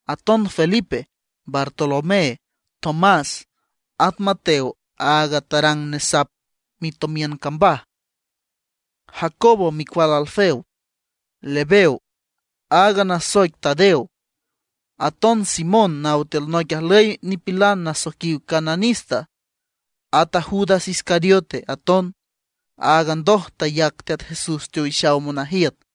Aton Felipe, Bartolomé, Tomás; at Mateo aaga tarang nesap mitomiün cambaj; Jacobo micual Alfeo; Lebeo aaga nasoic Tadeo; aton Simón naw tiül noic ajlüy nipilan nasoiquiw Cananista; at a Judas Iscariote aton, aaga ndoj tayac Teat Jesús teowixaw monajiüt.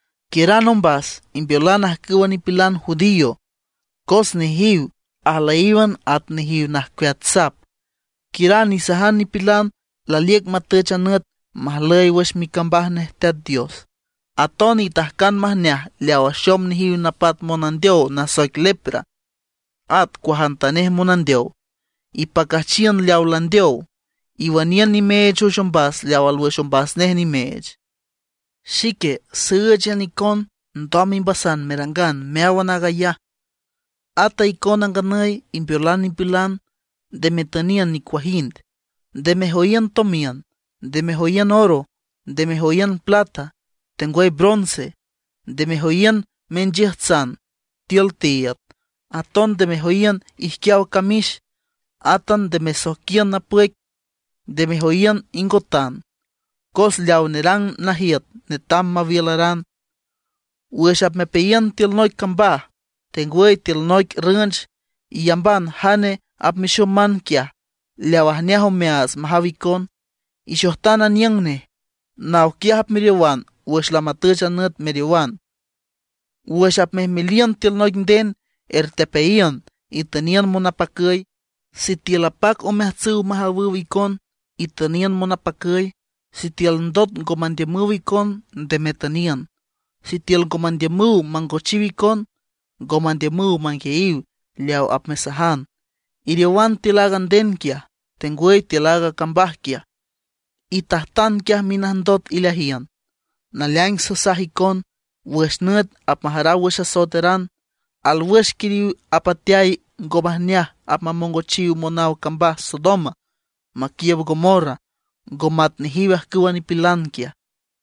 Quiüran ombas, imbeolan ajcüwa nipilan judío, cos nejiw ajlüyíwan at nejiw najcueat sap. Quiüran isajan nipilan laliüc matüch a nüt majlüy wüx micambaj nej Teat Dios. Aton itajcan majneaj leaw axom nejiw napat monandeow nasoic lepra, at cuajantanej monandeow. Ipacüjchiün leaw landeow, iwüniün nimeech wüx ombas leaw alwüx ombas nej nimeech. Xique sǘüchan icon ndoj imbasan merangan meáwan aag ayaj, ata icona nganüy imbeolan nipilan, nde metüniün nicuajind. ’Nde mejoyiün tomiün, nde mejoyiün oro, nde mejoyiün plata, tengwüy bronce. Nde mejoyiün minchiüjtsan tiül tiiüd, aton nde mejoyiün ijquiaw camix. Átan nde mesoijquiün napüic, nde mejoyiün ingotan. Cos leaw nerang najiüt netam mawiülaran. ’Wüx apmepeayiün tiül noic cambaj, tengwüy tiül noic rünch, iyamban jane apmexoman quiaj leaw ajneaj omeaats majaw icon. Ixojtan aniüng nej; naw quiaj apmeriowan wüx lamatüch a nüt meriowan. Wüx apmejmeliün tiül noic nden ertepeayiün, itüniün monapacüy. Sitiül apac omeajtsüw majawüw icon, itüniün monapacüy; sitiül ndot ngo mandiümüw icon nde metüniün. Sitiül ngo mandiümüw mangochiw icon, ngo mandiümüw manguiayiw leaw apmesajan, iriowan tiül aaga nden quiaj, tengwüy tiül aaga cambaj quiaj. Itajtan quiaj minajndot ileajiün. Naleaing sasaj icon, wüx nüt apmajaraw wüx asoeteran, alwüx quiriw apateay ngo majneaj apmamongochiw monaw cambaj Sodoma maquiiüb Gomorra, ngo mat nejiw ajcüwa nipilan quiaj.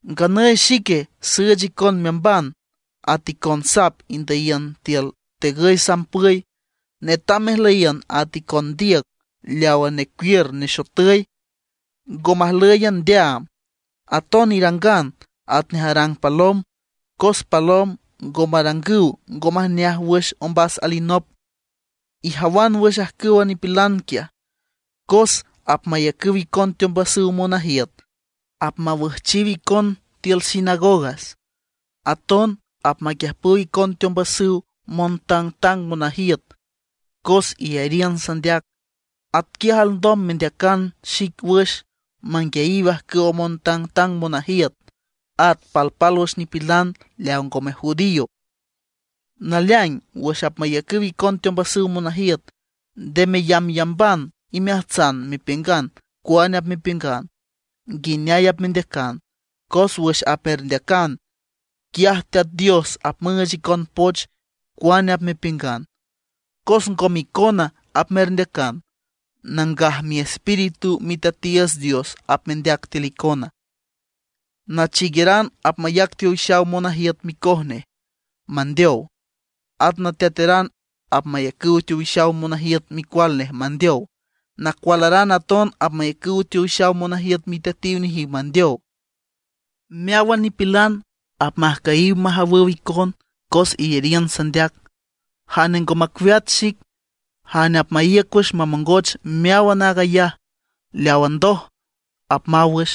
’Nganüy xique süüch icon meamban at icon sap indüyiün tiül tegüy sampüy. Netam mejlüyiün at icon ndiüc leawa necuiür nexotüy, ngo majlǘyan ndeaam. Aton irangan atnej arang palom, cos palom ngo marangüw ngo majneaj wüx ombas alinop. Ijawan wüx ajcüwa nipilan quiaj, cos apmayacüw icon teombasüw monajiüt, apmawüjchiw icon tiül sinagogas. Aton apmaquiüjpüw icon teombasüw montangtang monajiüt cos iyariün sandeac. Atquiaj alndom mendeacan xic wüx manguiayiw ajcüwa montangtang monajiüt, at palpálwüx nipilan leaw ngome judío. Naleaing wüx apmayacüw icon teombasüw monajiüt, nde meyambyamban imeajtsan mepiüngan cuane apmepiüngan, nguineay apmendeacan, cos wüx apmerndeacan, quiaj Teat Dios apmüüch icon poch cuane apmepiüngan. Cos ngome icona apmerndeacan, Nangaj Miespíritu Miteatiiüts Dios apmendeac tiül icon. ’Nachiigueran apmayac teowixaw monajiüt micoj nej mandeow. At nateateran apmayacüw teowixaw monajiüt micual nej mandeow. Nacualaran aton apmayacüw teowixaw monajiüt miteatiw nejiw mandeow. Meáwan nipilan apmajcüyiw majawüw icon cos iyariün sandeac. Jane ngo macueat xic, jane apmaíüc wüx mamongoch meáwan aag ayaj leawa ndoj, apmaw wüx.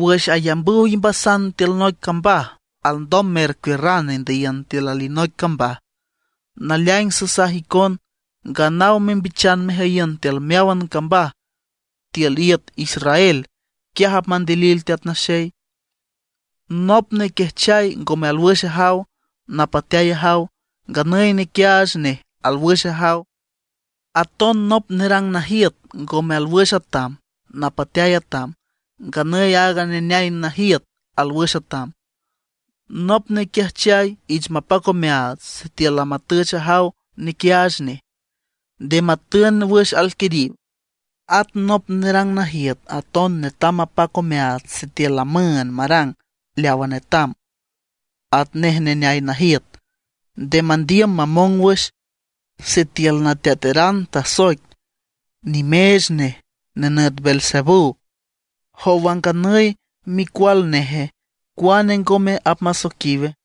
Wüx ayambüw imbasan tiül noic cambaj alndom mercuiürran indüyiün tiül alinoic cambaj. Naleaing sasaj icon, nganaw membichan mejüyiün tiül meáwan cambaj tiül iüt Israel, quiaj apmandilil Teat Naxey. ’Nop nequiajchay ngome alwüx ajaw, napateay ajaw; nganüy nequiaach nej alwüx ajaw. Aton nop nerang najiüt ngome alwüx atam, napateay atam; nganüy aaga neneay najiüt alwüx atam. Nop nequiajchay ich mapac omeaats sitiül lamatüch ajaw nequiaach nej, nde matün wüx alquiriw; at nop nerang najiüt aton netam mapac omeaats sitiül lamüünd marang leawa netam, atnej neneay najiüt, nde mandiüm mamong wüx. Sitiül nateateran tasoic nimeech nej, nenüt Beelzebú, ¿jowa nganüy a micual neje, cuane ngome apmasoiquiwe?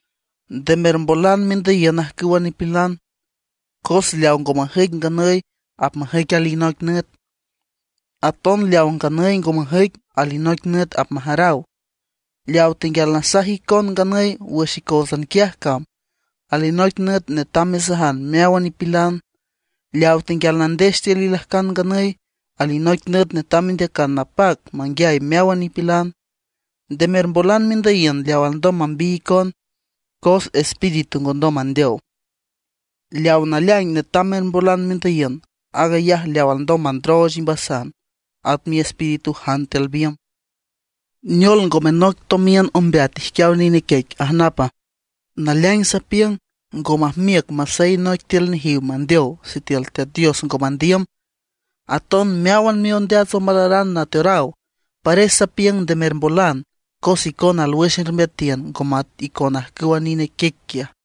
’Nde mermbolan mendüyiün ajcüwa nipilan, cos leaw ngo majüic nganüy apmajüic alinoic nüt; aton leaw nganüy ngo majüic alinoic nüt apmajaraw. Leaw tenguial nasaj icon nganüy wüx icóotsan quiaj cam, alinoic nüt netam mesajan meáwan nipilan. Leaw tenguial nandex tiül ilajcan nganüy, alinoic nüt netam mendeacan napac manguiay meáwan nipilan. Nde mermbolan mendüyiün leaw alndom mambiy icon, cos espíritu ngondom mandeow. Leaw naleaing netam mermbolan mendüyiün, aag ayaj leaw alndom mandrooch imbasan, at miespíritujan tiül biümb. ’¿Neol, ngome noic tomiün ombeat ijquiaw nine quiec ajnapa? Naleaing sapiüng ngo majmiüc masey noic tiül nejiw mandeow sitiül Teat Dios ngo mandiüm. Aton meáwan miondeats omalaran nateoraw. Pares sapiüng nde mermbolan cos icona alwüx ermbeatiün ngo mat icon ajcüwa nine quiec quiaj.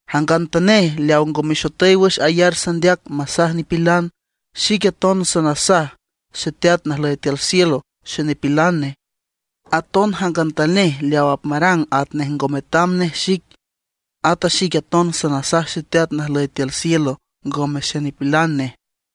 ’Jangantanej leaw ngo mexotüy wüx ayar sandeac masaj nipilan, xique aton sanasaj Xeteat najlüy tiül cielo xenipilan nej. Aton jangantanej leaw apmarang atnej ngo metam nej xic, ata xique aton sanasaj Xeteat najlüy tiül cielo ngome xenipilan nej.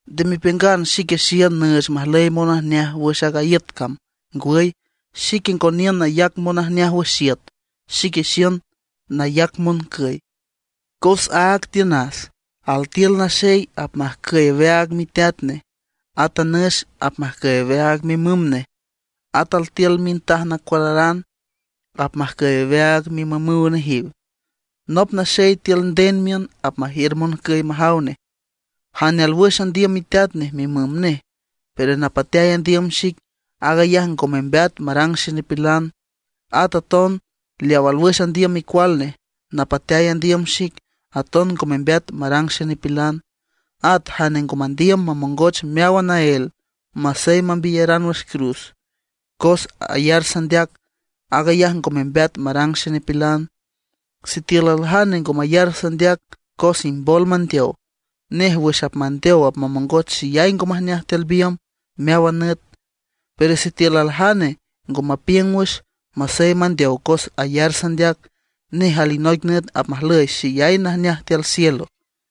’Nde mepiüngan xique xiün nüüch majlüy monajneaj wüx aaga iüt cam. Ngwüy, xique ngo niün nayac monajneaj wüx iüt, xique xiün nayac moncüy. Cos áag tiünas, altiül naxey apmajcüy aweaag miteat nej, ata nüx apmajcüy aweaag mimüm nej; at altiül mintaj nacualaran apmajcüy aweaag mimümüw nejiw. Nop naxey tiül nden miün apmajiür moncüy majaw nej. ’Jane alwüx andiüm miteat nej mimüm nej, pero napateay andiüm xic, aag ayaj ngo membeat marang xenipilan. At aton leaw alwüx andiüm micual nej, napateay andiüm xic, aton ngo membeat marang xenipilan. At jane ngo mandiüm mamongoch meáwan naél masey mambiyaran wüx cruz cos ayar sandeac, aag ayaj ngo membeat marang xenipilan. Sitiül aljane ngo mayar sandeac cos imbol mandeow, nej wüx apmandeow apmamongoch xeyay ngo majneaj tiül biümb meáwan nüt. Pero sitiül aljane ngo mapiüng wüx, masey mandeow cos ayar sandeac, nej alinoic nüt apmajlüy xeyay najneaj tiül cielo.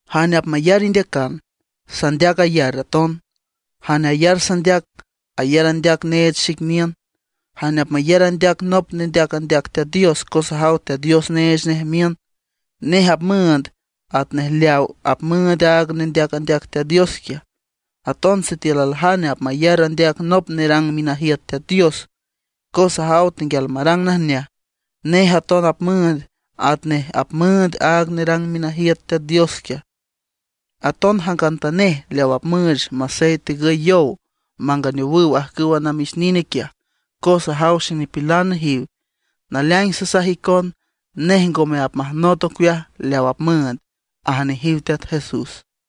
’Jane apmayar indeacan, sandeac ayar aton. Jane ayar sandeac, ayar andeac neech xic niün. Jane apmayar andeac nop nendeac andeac Teat Dios cos ajaw Teat Dios neech nej miün, nej apmüünd atnej leaw apmüünd aaga nendeac andeac Teat Dios quiaj. Aton sitiül aljane apmayar andeac nop nerang minajiüt Teat Dios cos ajaw tenguial marang najneaj, nej aton apmüünd atnej apmüünd aaga nerang minajiüt Teat Dios quiaj. Aton jangantanej leaw apmüüch masey tegüy yow manganeowüw ajcüwa namix nine quiaj, cos ajaw xenipilan nejiw; naleaing sasaj icon, nej ngome apmajnot ocueaj leaw apmüünd ―aj nejiw Teat Jesús.